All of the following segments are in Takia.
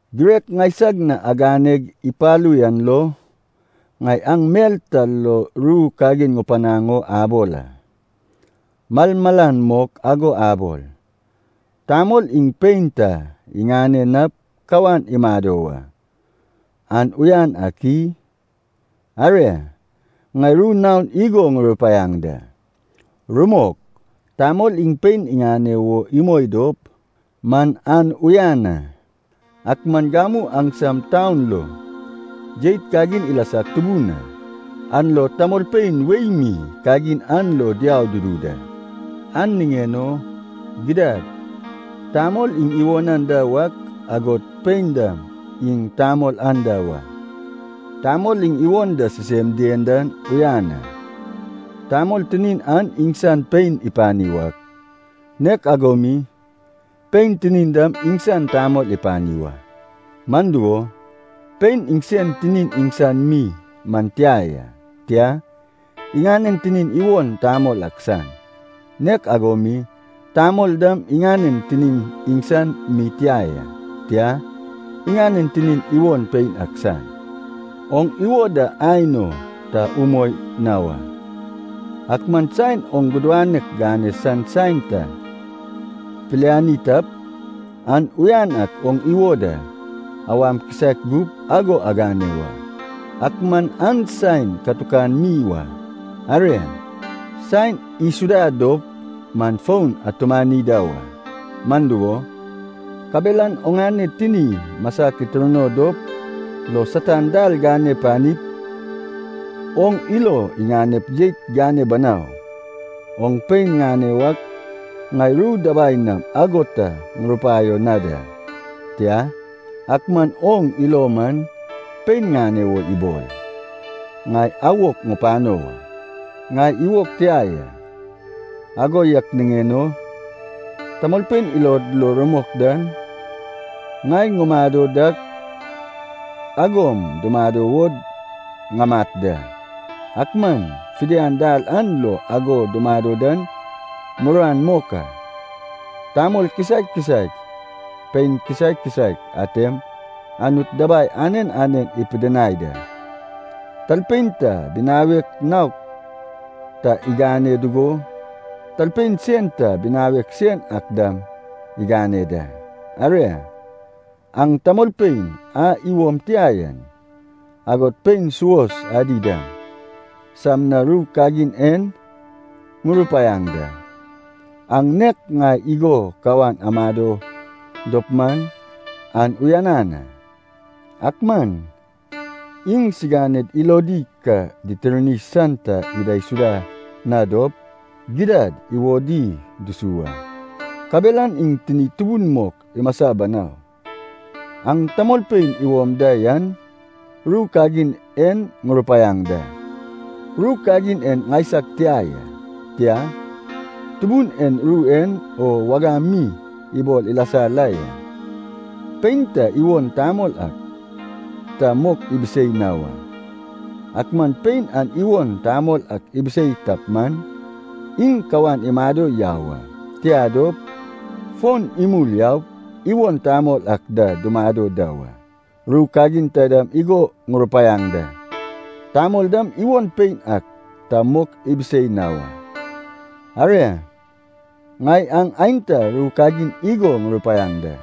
Girek ŋaisag na aganeg ipalu yan lo, ŋai aŋ mel ta lo ru kagin ŋupanaŋ o abol a. Malmalan mok ago abol, tamol iŋ pein ta iŋane nap kawan imado wa, an uyan ak i? Aria, ŋai ru naon igo ŋurupaiaŋ da. Rumok, tamol iŋ pein iŋane wo imoi dop man an uyan a. Ak man gamu aŋsam taun lo jeit kagin ilasag tubun a, an lo tamolpein wei mi kagin an lo diau dudu da. An niŋen o gidad tamol iŋ iwon anda wak, agod pein dam iŋ tamol anda wa. Tamol iŋ iwon da sisem dien dan uyan a. Tamol tinin an iŋsan pein ipani wak, nek ago mi pein tinin dam iŋsan tamol ipani wa. Man dugo, pein iŋsen tinin iŋsan mi man tia ya, tia, iŋanen tinin iwon tamol ak san. Nek ago mi tamol dam iŋanen tinin iŋsan mi tia ya, tia, iŋanen tinin iwon pein ak san. Oŋ iwo da aen o ta umoi na wa. Ak man saen oŋ gudanek gane san saen ta piliani tap, an uyan ak oŋ iwo da awam kisaek gup ago agane wa, ak man an saen katukan mi wa. Aria, saen isuda dop man fon atumani da wa. Man dugo, kabelan oŋane tini masak itirno dop lo Satan dal gane panip oŋ ilo iŋanep jeit gane banau. Oŋ pein ŋane wak ŋai ru dabai nam ago ta ŋurupaio na da. Tia, ak man oŋ ilo man, pein ŋane wo ibol, ŋai awok ŋupano wa. Ŋai iwog tia ya, ago yak niŋen o tamolpein ilod lo rumok dan, ŋai ŋumado dak agom dumado wo ŋamat da. Ak man fidian dal an lo ago dumado dan muruan mok a. Tamol kisaek kisaek, pein kisaek kisaek atem Anut dabai anen anen ipidinai da, talpein ta binawek naok ta iŋane dugo talpein sen ta binawek sen ak dam iŋane da. Aria, aŋ tamolpein a iwom tia yan, agod pein suos adi dam, sam na ru kagin en ŋurupaiaŋ da. Aŋ nek ŋai igo kawan amado dop man, an uyanan a. Ak man iŋ siganed ilodi ka ditirni san ta idaisuda na dop, gidad iwodi dusu wa. Kabelan iŋ tinid tubun mok imasa banau. Aŋ tamolpein iwom da yan ru kagin en ŋurupaiaŋ da. (Ru kagin en ŋaisag tia ya, tia, Tubun en ru en o wagam mi ibol ilasa la ya.) Pein ta iwon tamol ak ta mok ibisei na wa. Ak man pein an iwon tamol ak ibisei tap man, iŋ kawan imado yau a. Tia dop, fon imul yaup iwon tamol ak da dumado da wa. Ru kagin taidam igo ŋurupaiaŋ da, tamol dam iwon pein ak ta mok ibisei na wa. Aria, ŋai aŋ aenta ru kagin igo ŋurupaiaŋ da.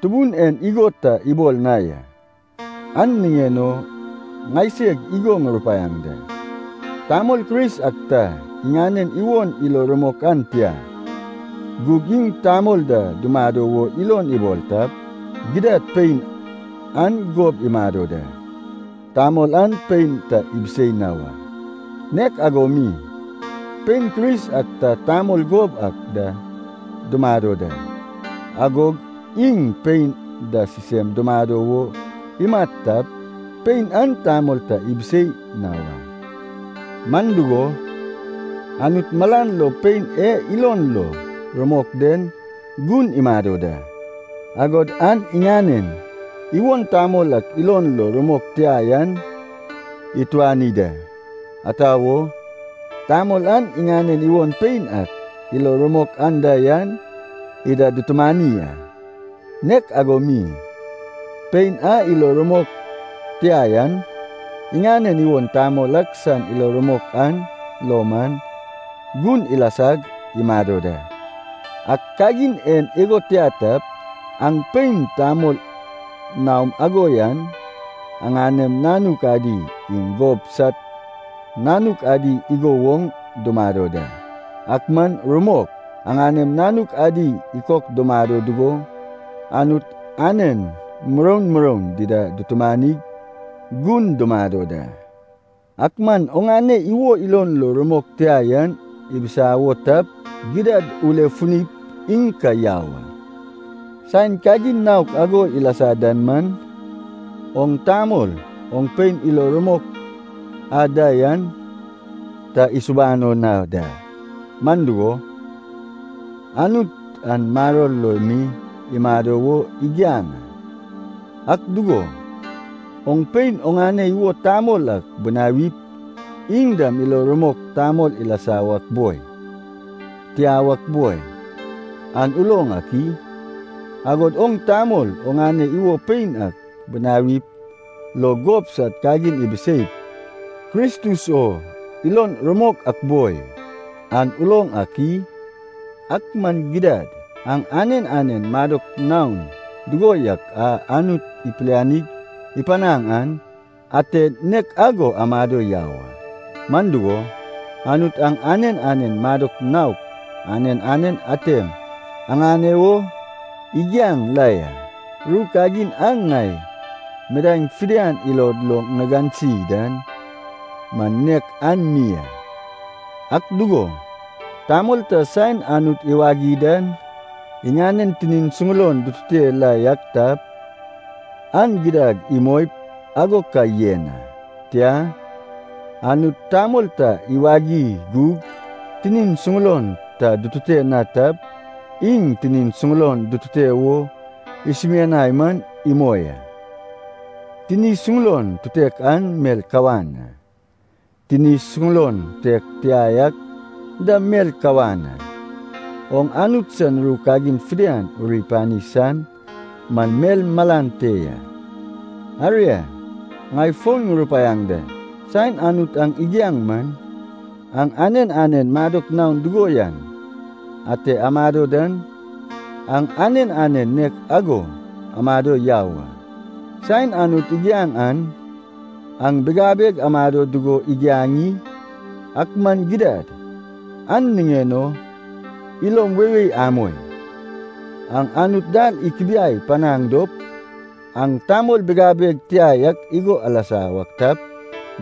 (Tubun en igo ta ibol na ya, an niŋen o ŋaiseg igo ŋurupaiaŋ da.) Tamol Kris ak ta iŋanen iwon ilon rumok an tia, gug iŋ tamol da dumado wo ilon ibol tap, gidad pein an gob imado da, tamol an pein ta ibisei na wa. Nek ago mi pein Kris ak ta tamol gob ak da dumado da, agog iŋ pein da sisem dumado wo imat tap, pein an tamol ta ibisei na wa. Man dugo, Anut malan lo pein e ilon lo rumok den gun imado da, agod an iŋanen iwon tamol ak ilon lo rumok tia yan ituani da, ata wo, tamol an iŋanen iwon pein ak ilo rumok anda yan ida dutumani a. Nek ago mi, pein a ilon lo rumok tia yan, iŋanen iwon tamol ak san ilo rumok an lo man, gun ilasag imado da. Ak kagin en igo tia tap, aŋ pein tamol naom ago yan aŋanem nanuk adi iŋ gob sad nanuk adi igo woŋ dumado da. Ak man rumok, aŋanem nanuk adi ikok dumado dugo Anut anen muroun muroun dida dutumanig gun dumado da. Ak man oŋane iwo ilon lo rumok tia yan ibisawo tap, gidad ulefunip iŋ ka yau a. Saen kagin naok ago ilasa dan man, oŋ tamol oŋ pein ilo rumok a da yan ta isubano na da. Man dugo, Anut aŋ maror lo mi amado wo igiaŋ a. Ak dugo, oŋ pein oŋane iwon tamol ak binawip iŋ dam ilo rumok tamol ilasa wak boi, tia wak boi, an uloŋ ak i? Agod oŋ tamol oŋane iwon pein ak binawip lo gob sad kagin ibiseip Kristus o ilon rumok ak boi, an uloŋ ak i? Ak man gidad, aŋ anen anen madok naon dugo yak a Anut ipilianig ipanaŋ an, ate nek ago amado yau a. Man dugo, Anut aŋ anen anen madok naok anen anen atem aŋane wo igiaŋ la ya. Ru kagin a ŋai midaeŋ fidian ilod lo ŋigansi dan man nek an mi a. Ak dugo, tamol ta saen Anut iwagi dan iŋanen tinin suŋulon dutute la yak tap, an gidad imoip ago ka yen a. Tia, Anut tamol ta iwagi gug tinin suŋulon ta dutute na tap, iŋ tinin suŋulon dutute wo isumianai man imoi a. Tini suŋulon tutek an mel kawan a, tini suŋulon tutek tia yak dam mel kawan a. Oŋ Anut san ru kagin fidian uri pani san man mel malan te ya. Aria, ŋai fon ŋurupaiaŋ da, saen Anut aŋ igiaŋ man, aŋ anen anen madok naon dugo yan ate amado dan, aŋ anen anen nek ago amado yau a. Saen Anut igiaŋ an aŋ bigabeg amado dugo igiaŋ i? Ak man gidad, an niŋen o ilom weiwei amoi. Aŋ Anut dal ikubiai panaŋ dop aŋ tamol bigabeg tia yak igo alasa wak tap,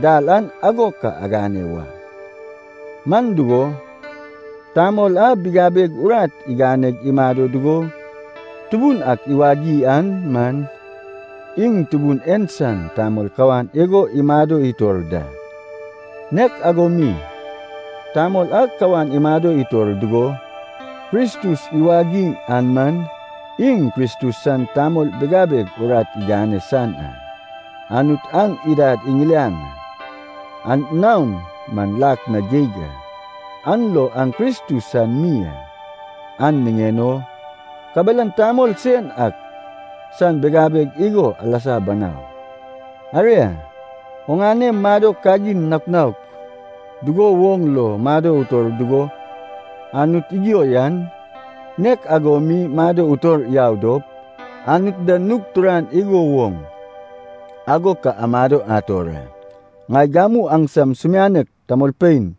dal an ago ka agane wa. Man dugo, tamol a bigabeg urat iganeg imado dugo Tubun ak iwagi an man, iŋ Tubun en san tamol kawan igo imado itor da. Nek ago mi, tamol a kawan imado itor dugo Kristus iwagi an man, iŋ Kristus san tamol bigabeg urat igane san a. Anut aŋ idad iŋiliaŋ a, an naon man lak na geig a. An lo aŋ Kristus san mi a, an niŋen o kabelan tamol sen ak san bigabeg igo alasa banau. Aria, oŋane madok kagin naok naok dugo woŋ lo mado utor dugo Anut igio yan, nek ago mi mado utor yau dop, Anut da nug turan igo woŋ ago ka amado ator a. Ŋai gamu aŋsam sumianek tamolpein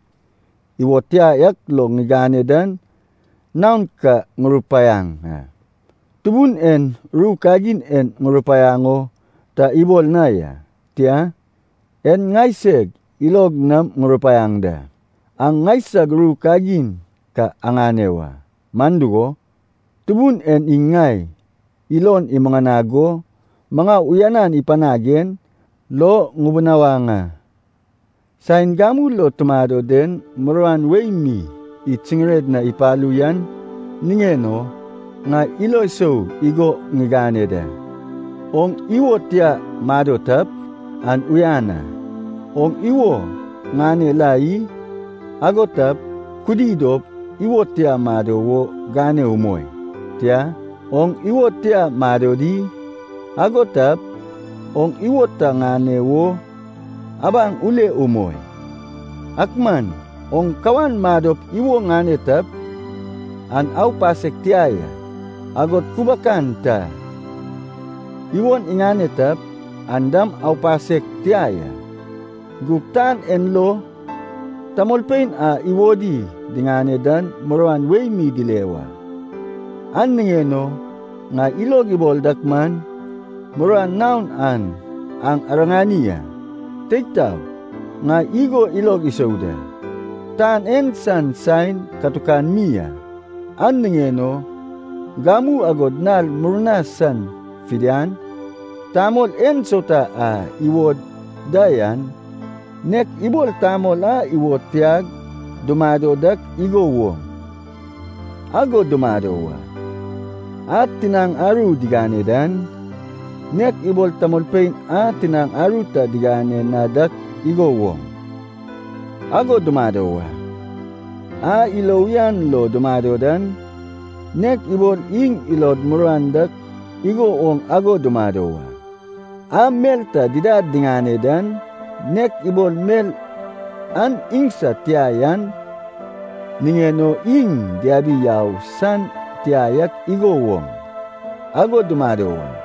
iwod tia yak lo agane dan naon ka ŋurupaiaŋ a. Tubun en ru kagin en ŋurupaiaŋ o ta ibol na ya. Tia, en ŋaiseg ilog nam ŋurupaiaŋ da. Aŋ ŋaisag ru kagin ka aŋane wa, man dugo, Tubun en iŋ ŋai ilon imuŋanag go maŋau uyanan ipanag en lo ŋubunawaŋ a. Saen gamu lo tumado den muruan wei mi id siŋired na ipalu yan niŋen o, ŋai ilo sou igo ŋigane da, oŋ iwo tia mado tap, an uyan a. Oŋ iwo ŋane la i? Ago tap, kudi dop iwo tia mado wo gane umoi. Tia, oŋ iwo tia mado di? Ago tap, oŋ iwo ta ŋane wo abaŋ ule umoi. Ak man oŋ kawan madop iwo ŋane tap, an aupasek tia ya. Agod kubakan ta iwon iŋane tap, an dam aupasek tia ya. Gug tan en lo tamolpein a iwodi diŋane dan muruan wei mi dile wa, an niŋen o ŋai ilog ibol dak man, muruan naok an aŋ iriŋanaŋ a. Teig taog, ŋai igo ilog isou da. Tan en san saen katukan mi a. An niŋen o gamu agod nal murna san fidian, tamol ensauta a iwod da yan, nek ibol tamol a iwod tiag dumado dak igo woŋ, ago dumado wa. A tinaŋ aru digane dan, nek ibol tamolpein a tinaŋ aru ta digane na dak igo woŋ, ago dumado wa. A ilo uyan lo dumado dan, nek ibol iŋ ilod muruan dak igo woŋ ago dumado wa. A mel ta didad diŋane dan, nek ibol mel an iŋsad tia yan niŋen o iŋ diabi yau san tia yak igo woŋ, ago dumado wa.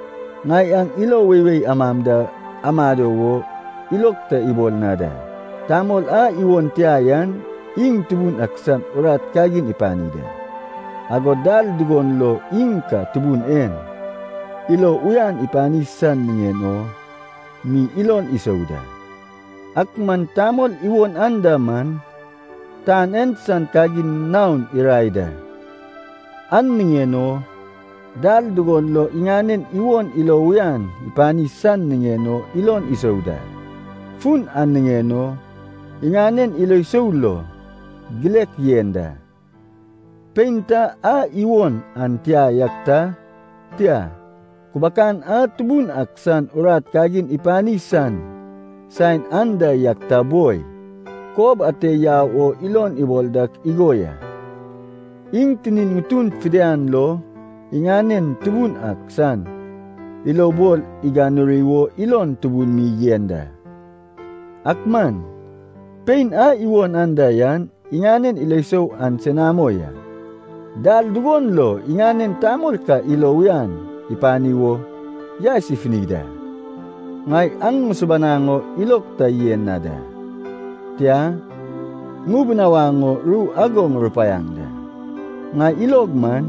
Ŋai aŋ ilo weiwei amam da amado wo ilog ta ibol na da. Tamol a iwon tia yan iŋ Tubun ak san urat kagin ipani da, agod dal dugon lo iŋ ka Tubun en ilo uyan ipani san niŋen o mi ilon isou da. Ak man tamol iwon anda man, tan en san kagin naon irae da, an niŋen o dal dugon lo iŋanen iwon ilo uyan ipani san niŋen o ilon isou da. Fun an niŋen o iŋanen ilo sou lo gilek yen da. Pein ta a iwon an tia yak ta, tia, kubakan a Tubun ak san urat kagin ipani san saen anda yak ta boi, kob ate yau o ilon ibol dak igo ya, iŋ tinin ŋutun fidian lo iŋanen Tubun ak san ilobol iganuri wo ilon tubun mi yen da. Ak man pein a iwon anda yan iŋanen ilo sou an senamo ya, dal dugon lo iŋanen tamol ka ilo uyan ipani wo yaes ifuni da. Ŋai aŋ ŋusubanaŋ o ilog ta yen na da, tia, ŋubunawaŋ o ru ago ŋurupaiaŋ da. Ŋai ilog man,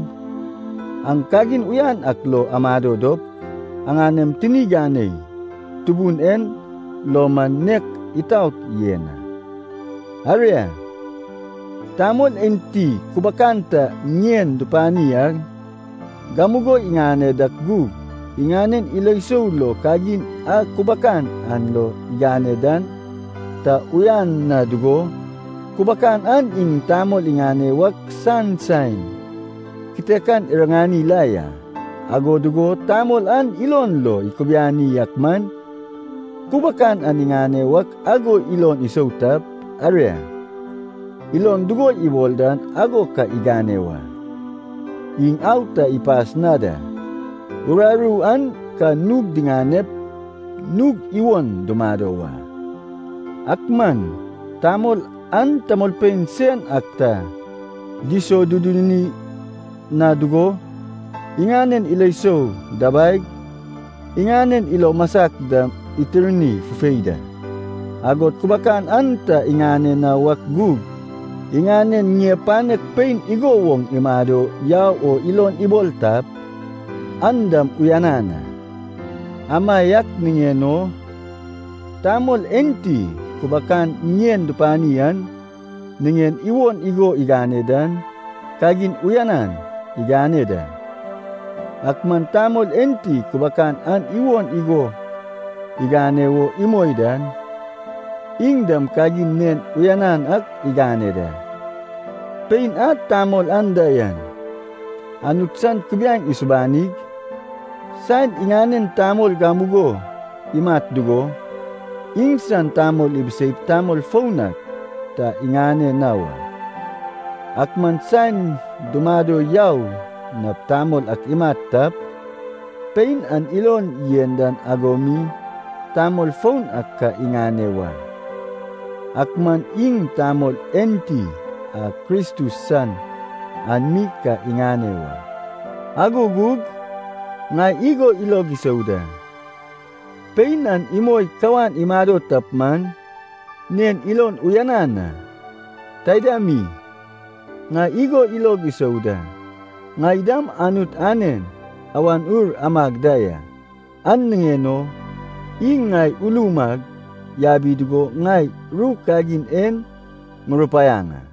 aŋ kagin uyan ak lo amado dop, aŋanem tini ganei Tubun en lo man nek itaot yen a. Aria, tamol enti kubakan ta ŋien dupani an, gamugo iŋane dak gug, iŋanen ilo sou lo kagin a kubakan an lo igane dan ta uyan na dugo, kubakan an iŋ tamol iŋane wak san saen kitekan iriŋani la ya, ago dugo tamol an ilon lo ikubiani ak man, kubakan an iŋane wak ago ilon isou tap, aria, ilon dugo ibol dan ago ka igane wa. Iŋ au ta ipas na da, uraru an ka nug diŋanep nug iwon dumado wa. Ak man tamol an tamolpein sen ak ta disoduduni na dugo, iŋanen ilo sou dabaig, iŋanen ilo masak dam itirni fufei da, agod kubakan an ta iŋane na wak gug iŋanen ŋie panek pein igo woŋ imado yau o ilon ibol tap, an dam uyanan a. Amaiak niŋen o tamol enti kubakan ŋien dupani an iŋanen iwon igo iŋane dan, kagin uyanan igane da. Ak man tamol enti kubakan an iwon igo iŋane wo imoi dan, iŋ dam kagin nen uyanan ak igane da. Pein a tamol anda yan, Anut san kubiaeŋ isubanig, saen iŋanen tamol gamugo imat dugo, iŋsan tamol ibiseip tamol foun ak ta iŋane na wa. Ak man saen dumado yau nap tamol ak imat tap, pein an iŋ ilon yen dan ago mi tamol foun ak ka iŋane wa. Ak man iŋ tamol enti a Kristus san an mi ka iŋane wa. Ago gug ŋai igo ilog isou da. Pein an imoi kawan imado tap man, nen ilon uyanan a. Taida mi, ŋai igo ilog isou da, ŋai dam Anut anen Awan Ur amag da ya, an niŋen o iŋ ŋai ulum ag yabi dugo ŋai ru kagin en ŋurupaiaŋ a.